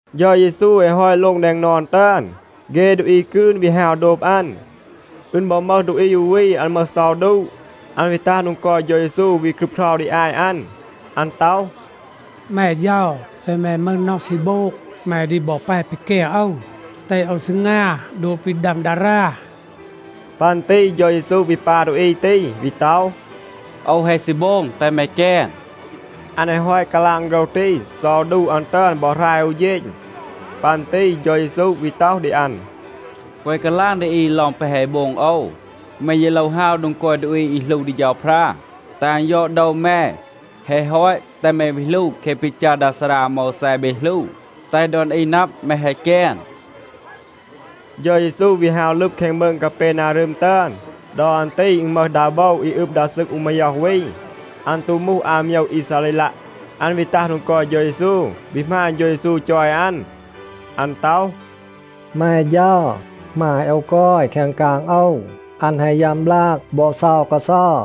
เฌา เยซู แฮะ ฮอต โลง แดง นอน ตึอน, เฆ ดูอี กืน วี ฮาว โดบ อัน. อึณ บอ มึห ดูอี อู วี, อัน มึห เซา ดูะ.a อัน วี ตัห โดง กอย เฌา เยซู วี ครึบเครา ดี อาต อัน. อัน ต็อห, “แม เฌา, เซ แม มึห น็อห ซี โบง, แม ดี บอ แป ปีแกน โอว, แตห โอว ซีงา โดบ ปี ดัม ดารา.” ปัน ตี เฌา เยซู วี ปา ดูอี ตี, วี ต็อห, “โอว แฮะ ซี โบง. แตห แม แกน.” อัน แฮะ ฮอต กาลาง โฆรห ตี, เซา ดูะ อัน ตึอน บอ หราย อู เฌณ. ปัน ตี เฌา เยซู วี ต็อห ดี อัน, “แกวะ กาลาง ดี อี ลอง แปะ แฮะ โบง โอว. แม ยี โลว ฮาว โดง กอย ดูอี อี หลู ดี เฌาพรา, แตห อัน ยอด โดว แม. แฮะ ฮอต, แตห แม วี หลู แคะ ปี จัร ดา ซารา อาโมวแซ เบ หลู, แตห ดอน อี นับ, แม แฮะ แกน.” เฌา เยซู วี ฮาว ลึบ แคง มืง กาเปนารึม ตึอน. ดอ อัน ตี อึณ มึห ดา โบว อี อึบ ดา ซึก อู มาย็อห วี. อัน ตู มูห อาโมยว อีซาเรลัะ. อัน วี ตัห โดง กอย เฌา เยซู, วี หมาณ เฌา เยซู จอย อัน. อัน ต็อห, “แม เฌา, หมาย โอว กอย แคง กาง โอว. อัน แฮะ ยัม บลาก บอ เซา กาเซา.”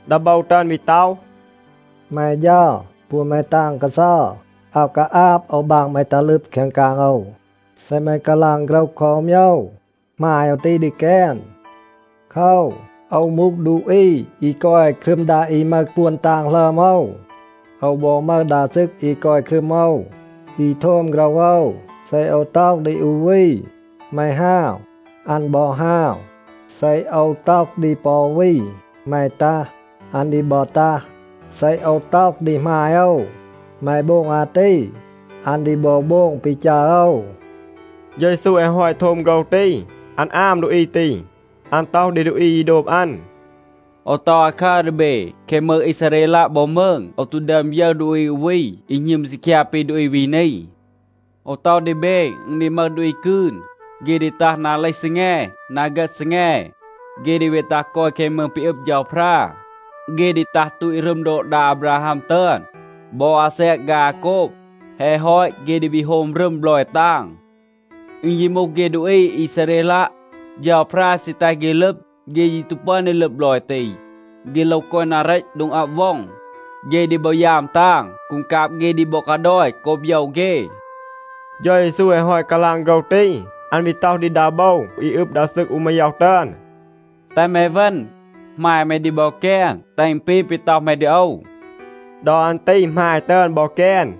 ดา โบว ตึอน วี ต็อห, “แม เฌา, ปวน แม ตาง กาเซา. อาว กาอาบ โอว บาง แม ตัห ลึบ แคง กาง โอว. เซ แม กาลาง โฆรห คอ อู โมยว, หมาย โอว ตี ดี แกน. โคว, โอว มูห ดูอี อี กอย ครึม ดา อี มึห ปวน ตาง หลึอม โอว. โอว บอ มึห ดา ซึก อี กอย ครึม โอว, อี โทม โฆรห โอว. เซ โอว ต็อห ดี อู วี, ‘แม ฮาว,’ อัน บอ ฮาว. เซ โอว ต็อห ดี ปอ อู วี, ‘แม ตัห,’ อัน ดี บอ ตัห. เซ โอว ต็อห ดี หมาย โอว, ‘แม โบง อาตี,’ อัน ดี บอ โบง ปี จัร โอว.” เฌา เยซู แฮะ ฮอต โทม โฆรห ตี, อัน อาม ดูอี ตี. อัน ต็อห ดี ดูอี อี โดบ อัน, “โอว ต็อห อาคัร ดี เบ, แคง มืง อีซาเรลัะ บอ มืง โอว ตู ดึอม ยึร ดูอี อู วี อี หณึม ซีคยา ปี ดูอี วี นี. โอว ต็อห ดี เบ, อึณ ดี มึห ดูอี กืน, เฆ ดี ตัห นา เลห ซีแง, นา เฆต ซีแง. เฆ ดี วี ตัห กอย แคง มืง ปี อึบ เฌาพรา. เฆ ดี ตัห ตูต รึม โดบ ดา อาบราฮัม ตึอน บอ อาแซก ฆาย อาโกบ. แฮะ ฮอต เฆ ดี วี โฮม รึม บลอย ตาง. อึณ ยี มูห เฆ ดูอี อีซาเรลัะ, เฌาพรา ซี แตห เฆ ลึบ. เฆ ยี ตู ปึอน ดี ลึบ บลอย ตี. เฆ โลว กอย นา เรต, โดง อับ ว็อง. เฆ ดี บอ ยาม ตาง. กูงกาบ เฆ ดี บอ กาดอย โกบ โยว เฆ.” เฌา เยซู แฮะ ฮอต กาลาง โฆรห ตี, อัน วี ต็อห ดี ดา โบว อี อึบ ดา ซึก อู มาย็อห ตึอน, “แตห แม เวณ. หมาย แม ดี บอ แกน, แตห อึณ ปี ปี ต็อห แม ดี โอว.” ดอ อัน ตี หมาย ตึอน บอ แกน.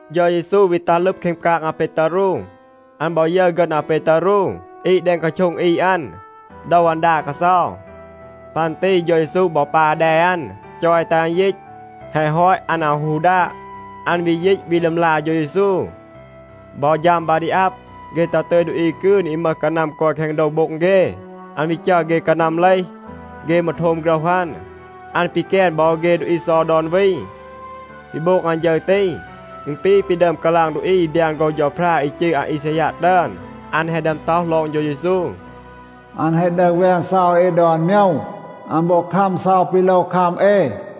เฌา เยซู วี ตัห ลึบ แคง กาง อาเปตารู. อัน บอ ยึร ฆึณ อาเปตารู อีด แดง กาโช็ง อีด อัน. โดว อัน ดาด กาเซา. ปัน ตี เฌา เยซู บอ ปา แด อัน, จอย แตห อัน ยีต. แฮะ ฮอต, อัน อาว ฮู ดาด. อัน วี ยีต, วี ลึมลา เฌา เยซู. บอ ฌัม บา ดี อับ, เฆ ตัห ตึย ดูอี กืน อี มึห กานัม กอย แคง โดว โบ็ง เฆ. อัน วี จัร เฆ กานัม เลห. เฆ มืร โทม โฆรห อัน. อัน ปีแกน บอ เฆ ดูอี เซา ดอน วี. ปี โบง อัน ฌึร ตี, อึณ ปี ปี ดึอม กาลาง ดูอี อี บยาน โฆรห เฌาพรา อี จืร อาอีซายัะ ตึอน. อัน แฮะ ดึอม ต็อห ลอง เฌา เยซู, “อัน แฮะ ดึห แวน เซา เอ ดอน โมยว. อัน บอ คัม เซา ปี โลว คัม เอ.”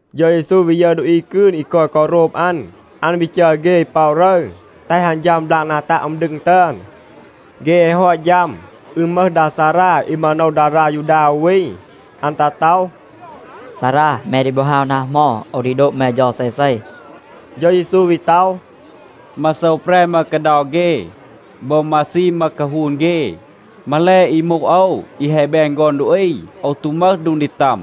เฌา เยซู วี ยึร ดูอี กืน อี กอย กอ โรบ อัน, อัน วี จัร เฆ ป็อะ รึร, แตห อัน ฌัม บลาก นา ตัะ อึม ดึง ตึอน. เฆ แฮะ ฮอต ฌัม, อึณ มึห ดา ซารา อี มาโนว ดารา ยูดา อู วี. อัน ตัห ต็อห, “ซารา, แม ดี บอ ฮาว นา เหมา, โอว ดี โดบ แม เฌา เซเซ.” เฌา เยซู วี ต็อห, “มาโซว แปร มึห กาเดา เฆ. บอ มาซีม มึห กาฮูน เฆ. มาแล อี มูห โอว, อี แฮะ แบน ฆอน ดูอี, โอว ตู มึห โดง ดี ตัม.”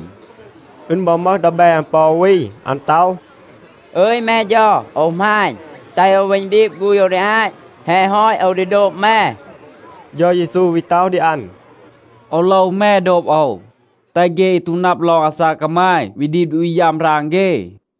อึณ บอ มึห ดีแบ อัน ปอ อู วี, อัน ต็อห, “อึย แม เฌา, โอว หมาณ, แตห โอว เวณ ดีบ ฆูณ โอว ดี อาต. แฮะ ฮอต, โอว ดี โดบ แม.” เฌา เยซู วี ต็อห ดี อัน, “โอว โลว แม โดบ โอว. แตห เฆ อี ตู นับ ลอง อาซาก กามาย วี ดีบ ดูอี ยัม ราง เฆ.”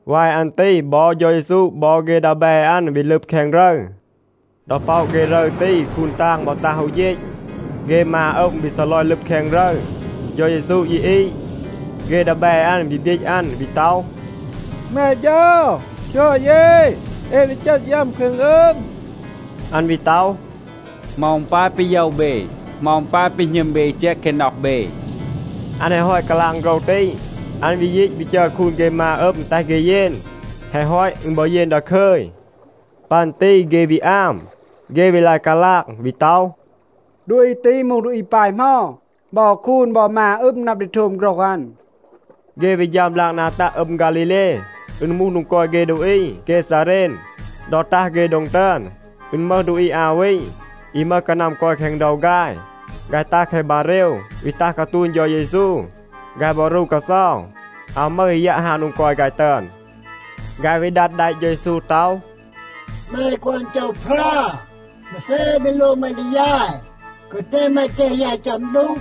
วาย อัน ตี บอ เฌา เยซู บอ เฆ ดีแบ อัน วี ลึบ แคง รึร. ดอ ป็อะ เฆ รึร ตี, คูน ตาง บอ ตัห อู เฌณ. เฆ มา อึม วี ซีลอย ลึบ แคง รึร. เฌา เยซู ยี อีด. เฆ ดีแบ อัน วี บยีต อัน, วี ต็อห, “แม เฌา, คยอด เย. เอ ดี เจต ยัม แคง อึม.” อัน วี ต็อห, “เหมา อึณ ปาย ปี โยว เบ? เหมา อึณ ปาย ปี หณึม เบ อี แจก แคง น็อห เบ?” อัน แฮะ ฮอต กาลาง โฆรห ตี, อัน วี ยีต วี จัร คูน เฆ มา อึม, แตห เฆ เยน. แฮะ ฮอต, อึณ บอ เยน ดาคึย. ปัน ตี เฆ วี อาม. เฆ วี ลาย กาลาง, วี ต็อห, “ดูอี ตี มูห ดูอี ปาย เหมา? บอ คูน บอ มา อึม นับ ดี โทม โฆรห อัน.” เฆ วี ฌัม บลาก นา ตัะ อึม ฆาลีเล, อึณ มูห โดง กอย เฆ ดูอี เกซาเรน. ดอ ตัห เฆ โดง ตึอน, อึณ มึห ดูอี อา วี, อี มึห กานัม กอย แคง โดว ฆาย. ฆาย ตัห แคง บาเรว, วี ตัห กาตูณ เฌา เยซู. ฆาย บอ รู กาเซา. อาว มึห อี ยัะ ฮาว โดง กอย ฆาย ตึอน. ฆาย วี ดัด แดะ เฌา เยซู ต็อห, “แม ฆอน เฌาพรา, มาเซ ปี โลว แม ดี ยาย? แกวะ แตห แม แตห ยาย ฌัม ดูก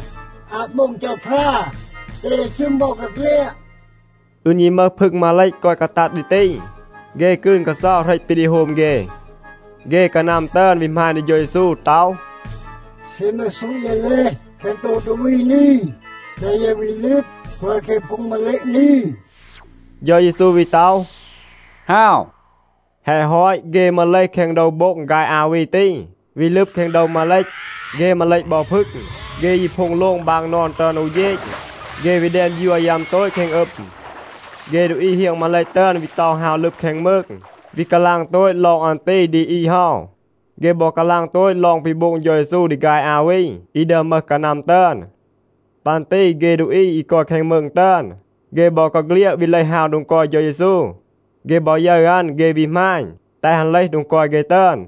อาต โบง เฌาพรา แตห เย ชึม บอกาเฆลียด.” อึณ ยี มึห พึง มาเลต กอย กาตัด ดี ตี. เฆ กืน กาเซา เหรต ปี ดี โฮม เฆ. เฆ กานัม ตึอน วี หมาณ ดี เฌา เยซู ต็อห, “เซ แม ซูต เย เลห แคง โดว ดูอี นี, แตห เย วี ลึบ กอย แคง พึง มาเลต นี.” เฌา เยซู วี ต็อห, “ฮาว.” แฮะ ฮอต, เฆ มืร เลห แคง โดว โบ็ง ฆาย อา วี ตี, วี ลึบ แคง โดว มาเลต. เฆ มาเลต บอ พึง, เฆ ยี โพ็ง โลง บาง นอน ตึอน อู เฌณ. เฆ วี แดน บยัว ยัม โตต แคง อึม. เฆ ดูอี เฮียง มาเลต ตึอน วี เตา ฮาว ลึบ แคง มืง, วี กาลาง โตต ลอง อัน ตี ดี อี เฮา. เฆ บอ กาลาง โตต ลอง ปี โบง เฌา เยซู ดี ฆาย อา วี อี ดึอม มึห กานัม ตึอน. ปัน ตี เฆ ดูอี อี กอย แคง มืง ตึอน, เฆ บอกาเฆลียด วี เลห ฮาว โดง กอย เฌา เยซู. เฆ บอ ยึร อัน, เฆ วี หมาณ, แตห อัน เลห โดง กอย เฆ ตึอน.